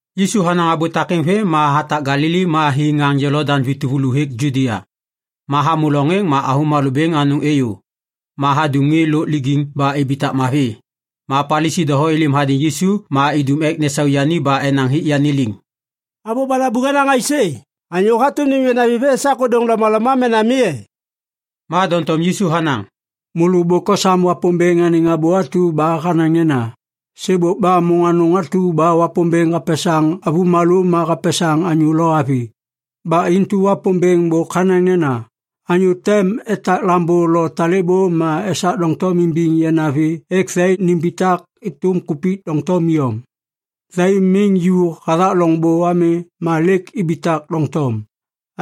Yisu hanaŋ abô takêŋ vêm ma hatak Galili ma hi ŋaŋ Jolodaŋ vi tuvulu hêk Judia. Ma hamô loŋ êŋ ma avômalô bêŋ anôŋ êyô. Ma hadum ŋê lôk lijiŋ ba ibitak mavi. Ma Palisi doho êlêm hadêŋ Yisu ma idum ek nesau yani ba enaŋ hik yani liŋ, “Abô balabuŋ hanaŋ aisê? Anyô hatôm nêm yanavi vê esak ôdôŋ lomaloma mena mi e?” Ma doŋtom Yisu hanaŋ, “Môlô bôk osam Wapômbêŋ anêŋ abô atu ba hanaŋ nena, ‘Sêbôk ba môŋ anôŋ atu ba Wapômbêŋ hapesaŋ avômalô ma hapesaŋ anyô lo avi. Ba intu Wapômbêŋ bôk hanaŋ nena, “Anyô tem etak lambô lo talêbô ma esak doŋtom imbiŋ yanavi ek thai nimbitak êtôm kupik doŋtom iyom.” ’ Thai miŋ ju hathak loŋbô ami ma lêk ibitak doŋtom.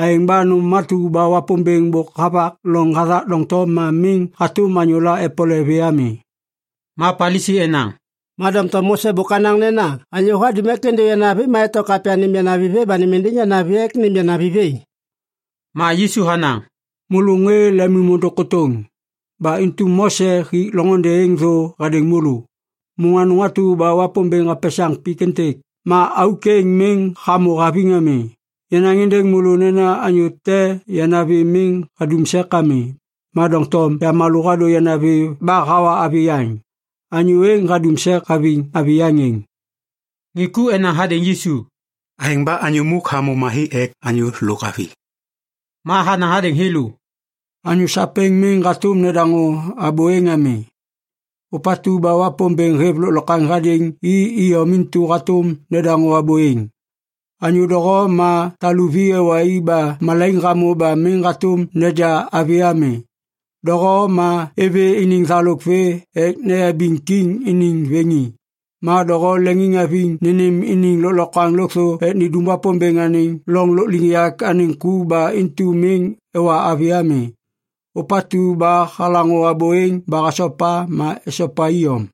Aêŋ ba nôm atu ba Wapômbêŋ bôk havak loŋ hathak doŋtom ma miŋ hatôm anyôla epole vê ami.” Ma Palisi enaŋ, “Ma doŋtom Mose bôk hanaŋ nena anyô hadum ek êndô yanavi ma eto kapya nêm yanavi vê ba nêm êndêŋ yanavi ek nêm yani vê.” Ma Yisu hanaŋ, “Môlô ŋê lemimôndôŋ kôtôŋ. Ba intu Mose hik loŋôndê êŋ thô hadêŋ môlô. Môŋ anôŋ atu ba Wapômbêŋ hapesaŋ pik êntêk, ma auk êŋ miŋ hamô haviŋ ami. Yanaŋ êndêŋ môlô nena anyô te yanavi miŋ hadum sek ami, ma doŋtom yamalô hadô yanavi ba hawa avi yaŋ. Anyô êŋ hadum sek haviŋ avi yaŋ êŋ.” Ŋê ku enaŋ hadêŋ Yisu, “Aêŋ ba anyô muk hamô mavi ek anyô lôk avi.” Ma hanaŋ hadêŋ thêlô, “Anyô sapêŋ miŋ hatôm nedaŋô abô êŋ ami. Ôpatu ba Wapômbêŋ hêv lôklokwaŋ hadêŋ i iyom intu hatôm nedaŋô abô êŋ. Anyô doho ma taluvi ewa i ba malaiŋ hamô ba miŋ hatôm neja avi ami. Doho ma êvê iniŋ thalôk vê ek neyabiŋ kiŋ iniŋ vêŋi. Ma doho leŋiŋhaviŋ nênêm iniŋ lôklokwaŋ lôkthô ek nindum Wapômbêŋ anêŋ loŋ lôkliŋyak anêŋ ku ba intu miŋ ewa avi ami. Ôpatu ba halaŋô abô êŋ ba hasopa, ma esopa iyom.”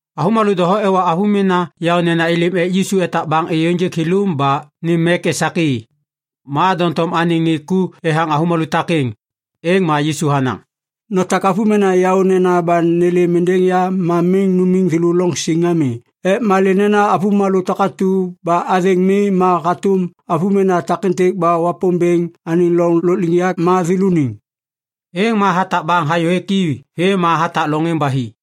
Avômalô doho ewa avômena yaônena êlêm ek Yisu etak baŋ êyô ênjêk thêlô ba nêm mek esak i. Ma doŋtom anêŋ ŋê ku ethaŋ avômalô takêŋ. Êŋ ma Yisu hanaŋ, “Notak avômena yaônena ba nêlêm êndêŋ ya ma miŋ numiŋ thêlô loŋ siŋ ami ek malê nena avômalô takatu ba athêŋ mi ma hatôm avômena takêntêk ba Wapômbêŋ anêŋ loŋ lôkliŋyak ma thêlôniŋ.” Êŋ ma hatak baŋ hayôhêk i vêm ma hatak loŋ êŋ ba hi.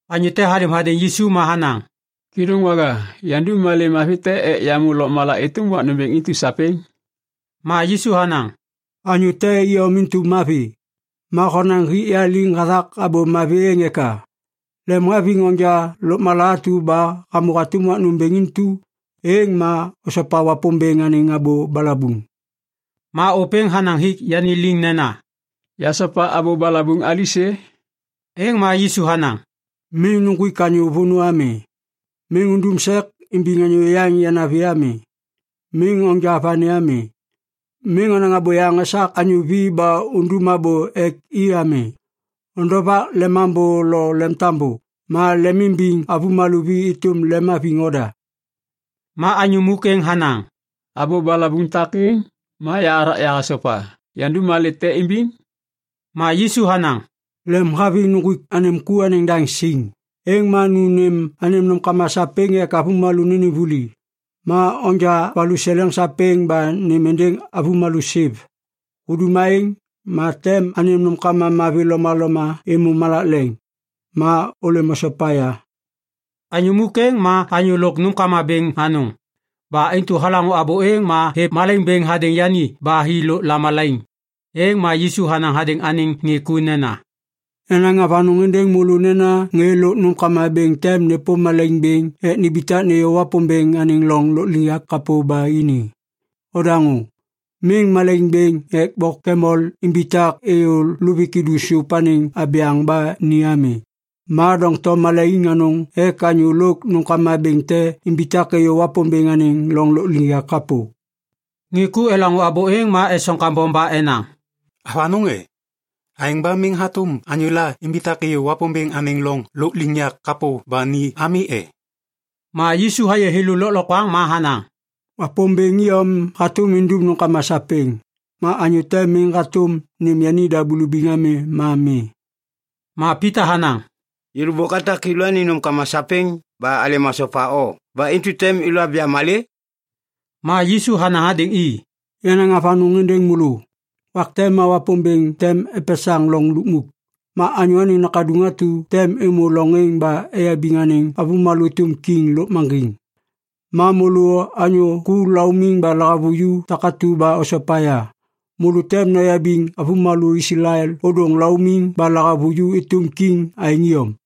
Anyô te halêm hadêŋ Yisu ma hanaŋ, “Kêdôŋwaga, yandum malê mavi te ek yamô lôkmala êtôm wak nômbêŋ intu sapêŋ?” Ma Yisu hanaŋ, “Anyô te iyom intu mavi! Ma honaŋ hik ya liŋ hathak abô ‘mavi’ êŋ eka? Lemhaviŋ onja lôkmala atu ba hamô hatôm wak nômbêŋ intu, êŋ ma osopa Wapômbêŋ anêŋ abô balabuŋ.” Ma ôpêŋ hanaŋ hik yani liŋ nena, “Yasopa abô balabuŋ alisê?” Êŋ ma Yisu hanaŋ, “‘Miŋ nuŋgwik anyô vônô ami. Miŋ undum sek imbiŋ anyô yaŋ yanavi ami. Miŋ onja vani ami. Miŋ onaŋ abôyaŋ esak anyô vi ba undum abô ek i ami. Ondovak lemambô lo lemtambô.’ Ma ‘lemimbiŋ avômalô vi êtôm lemhaviŋ oda.’” Ma anyô muk êŋ hanaŋ, “Abô balabuŋ takêŋ, ma yahathak yahasopa. Yandum malê te imbiŋ?” Ma Yisu hanaŋ, “Lemhaviŋ nuŋgwik anêm ku anêŋ daŋ siŋ, êŋ ma nu nêm anêm nômkama sapêŋ ek avômalô nênêm vuli. Ma onja valuseleŋ sapêŋ ba nêm êndêŋ avômalô siv. Hudum aêŋ, ma tem anêm nômkama mavi lomaloma êmô malak leŋ. Ma ôlêm osopa ya.” Anyô muk êŋ ma anyô lôk nômkama bêŋ anôŋ. Ba intu halaŋô abô êŋ ma hêv malaiŋ bêŋ hadêŋ yani ba hi lôk lamalaiŋ. Êŋ ma Yisu hanaŋ hadêŋ anêŋ ŋê ku nena, “Yanaŋ avanôŋ êndêŋ môlô nena ŋê lôk nômkama bêŋ tem nêpôm malaiŋ bêŋ ek nimbitak nêyô Wapômbêŋ anêŋ loŋ lôkliŋyak kapô ba ini. Odaŋô! Miŋ malaiŋ bêŋ ek bok kamel imbitak êyô luvik idu sôp anêŋ abyaŋ ba ni ami, ma doŋtom malaiŋ anôŋ ek anyô lôk nômkama bêŋ te imbitak êyô Wapômbêŋ anêŋ loŋ lôkliŋyak kapô.” Ŋê ku elaŋô abô êŋ ma esoŋ kambom ba enaŋ, “Avanôŋ e? Aêŋ ba miŋ hatôm anyôla imbitak êyô Wapômbêŋ anêŋ loŋ lôkliŋyak kapô ba ni ami e?” Ma Yisu hayê thêlô lôklokwaŋ ma hanaŋ, “Wapômbêŋ iyom hatôm indum nômkama sapêŋ. Ma anyô te miŋ hatôm nêm yanida bulubiŋ ami ma mi.” Ma Pita hanaŋ, “Yêlô bôk atak yêlôaniŋ nômkama sapêŋ ba alêm asopa o ba intu tem naja malê?” Ma Yisu hanaŋ hadêŋ i, “Yanaŋ avanôŋ êndêŋ môlô! Wak te ma Wapômbêŋ tem epesaŋ loŋ lukmuk. Ma Anyô Anêŋ Nakaduŋ atu tem êmô loŋ êŋ ba eyabiŋ anêŋ avômalô êtôm kiŋ lôkmaŋgiŋ. Ma môlô anyô ku laumiŋ ba lahavuju takatu ba osopa ya, môlô tem noyabiŋ avômalô Islael ôdôŋ laumiŋ ba lahavuju êtôm kiŋ aêŋ iyom.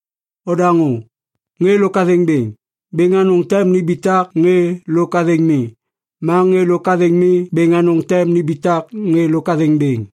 Odaŋô! Ŋê lôk athêŋ bêŋ, bêŋ anôŋ tem nimbitak ŋê lôk athêŋ mi. Ma ŋê lôk athêŋ mi bêŋ anôŋ tem nimbitak ŋê lôk athêŋ bêŋ.”